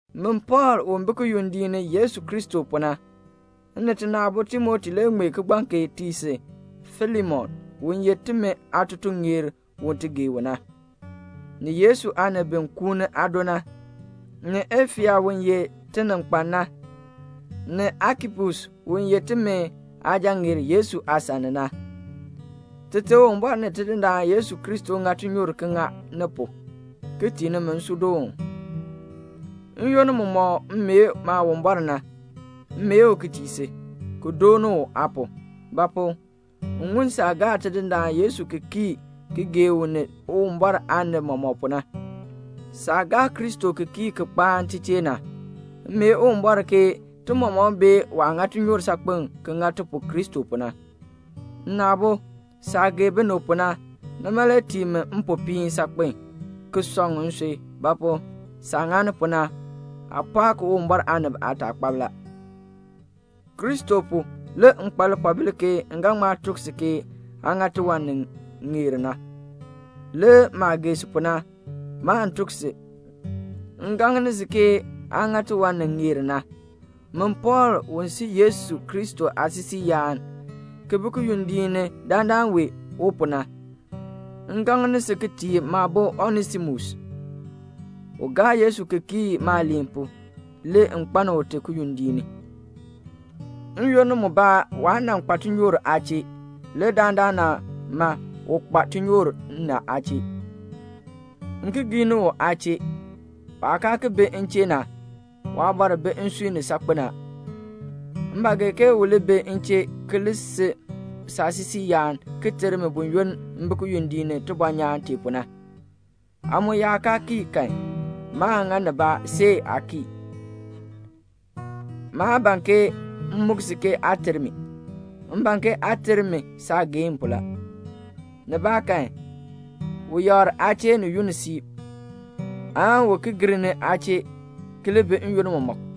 Min Pɔɔl u bi kiyondiik ni Yesu Kristo pu na, m ni tina aabo Timoti le ŋmee kigbaŋ kee ti tii si Filemon, u ye timi aatutuŋeer u ti gee u na, ni Yesu aanib bi kuuni aado na, ni Afia u ye tininkpan na, ni Akipus u ye timi aasujaŋeer Yesu aasan ni na. Tite Uwumbɔr ni Tidindaan Yesu Kristo ŋa tinyoor ki ŋa ni pu, ki tii nimi nsuudoon. N-yoonn mumɔk m mee Maawumbɔr na, m mee u ki tii si, ki dooni u aa pu; ba pu? m ŋun saah gaa Tidindaan Yesu ki kii ki gee u ni Uwumbɔr aanib mɔmɔk pu na. Saah gaa Kristo ki kii ki kpaan ti chee na, m mee Uwumbɔr ke ti mɔmɔk bee waah ŋa tinyoor saakpen ki ŋa ti pu Kristo pu na. Nna aabo, saah gee binib pu na, nima le tii mi mpopiin saakpen, ki sɔŋ nsui; ba pu? saah ŋani pu na, aa pɔɔk Uwumbɔr aanib aataakpab la. Kristo pu le m kpa lipoobil ki ga ŋma tuk si ke aa ŋa tiwan ni ŋeer na. Le maah gee si pu na, maan tuk si, m gaŋni si ke aa ŋa tiwan ni ŋeer na. Min Pɔɔl u si Yesu Kristo aasisiiyaan, ki bi kiyondiik ni dandana wee u pu na, m gaŋni si ki tii maabo Onesimus; u gaa Yesu ki kii maaliin pu, le m kpaln ute kiyondiik ni. N-yoonn mubaa waa nan kpa tinyoor aa chee; le dandana u kpa tinyoor m ni aa chee. M ki giini u aa chee. Waah kaa ki bi m chee na, waabɔr bi nsui ni saakpen a. M ba gee ke u li bi m chee ki li si saasisiiyaan ki ter mi buyoonn m bi kiyondiik ni tibɔnyaan tee pu na. Aa mu yaa kaa kii kan, maan ŋa nibaa see aa kii. Maa ban ke m muk si aa ter mi. M ban ke aa ter mi saageehn pu la. Nibaakan u yakr aa chee ni yunn siib, aan u ki gir ni aa chee ki li bi n-yoonn mɔmɔk.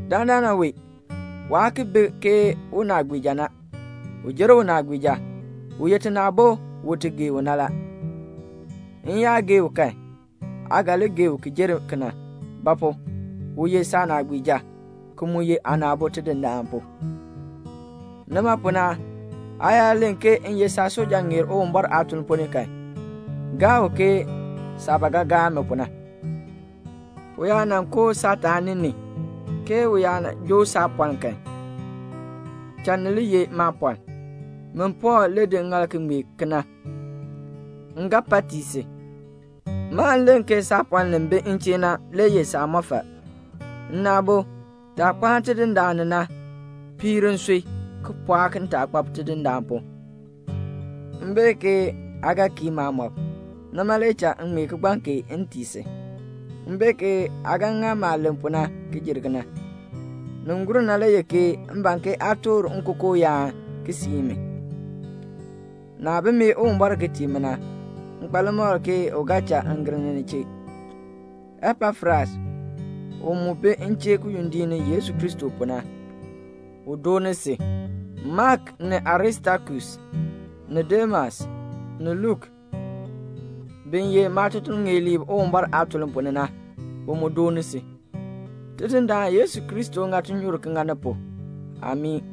Dandana wee, waa ki bi ke unaagbiija na. U jer unaagbiija. U ye tina aabo u ti gee u na la. M yaa gee u kan, aa ga li gee u ki jer kena; ba pu? u ye saanaagbiija, ki mu ye aana aabo Tidindaan pu. Nima pu na, aa yaa len ke m ye saatutuŋeer Uwumbɔr aatuln ponn ni kan, gaa u ke saah ba ga gaa mi pu na. U yaa nan koo saataani ni, ke u yaa joo saapɔln kan, cha ni li ye maapɔln. Min Pɔɔl, m di ŋŋaal ki ŋmee kena, m ga pa tii si. Maan len ke saapɔln li bi m chee na le ye saamɔfal. Nna aabo, taah kpaan Tidindaan ni na, piir nsui, ki pɔɔk ntaakpab Tidindaan pu. M bee ke aa ga kii maamɔb. Nima le cha m ŋmee kigbaŋ kee m tii si. M bee ke aa ga ŋa maah len pu na ki jer kena. Ni gur na le ye ke m ban ke aa toor nkookooyaan ki siin mi. Naah bi mee Uwumbɔr ki tii mi na, m kpa limakl ke u ga cha m gir ni ni chee. Epafras u mu bi m chee kiyondiik ni Yesu Kristo pu na, u dooni si. Mak, ni Aristakus, ni Demas, ni Luk, bi ye maatutuŋeerliib Uwumbɔr aatuln ponn ni na, bi mu dooni si. Tidindaan Yesu Kristo ŋa tinyoor ki ŋa ni pu. [Amii.]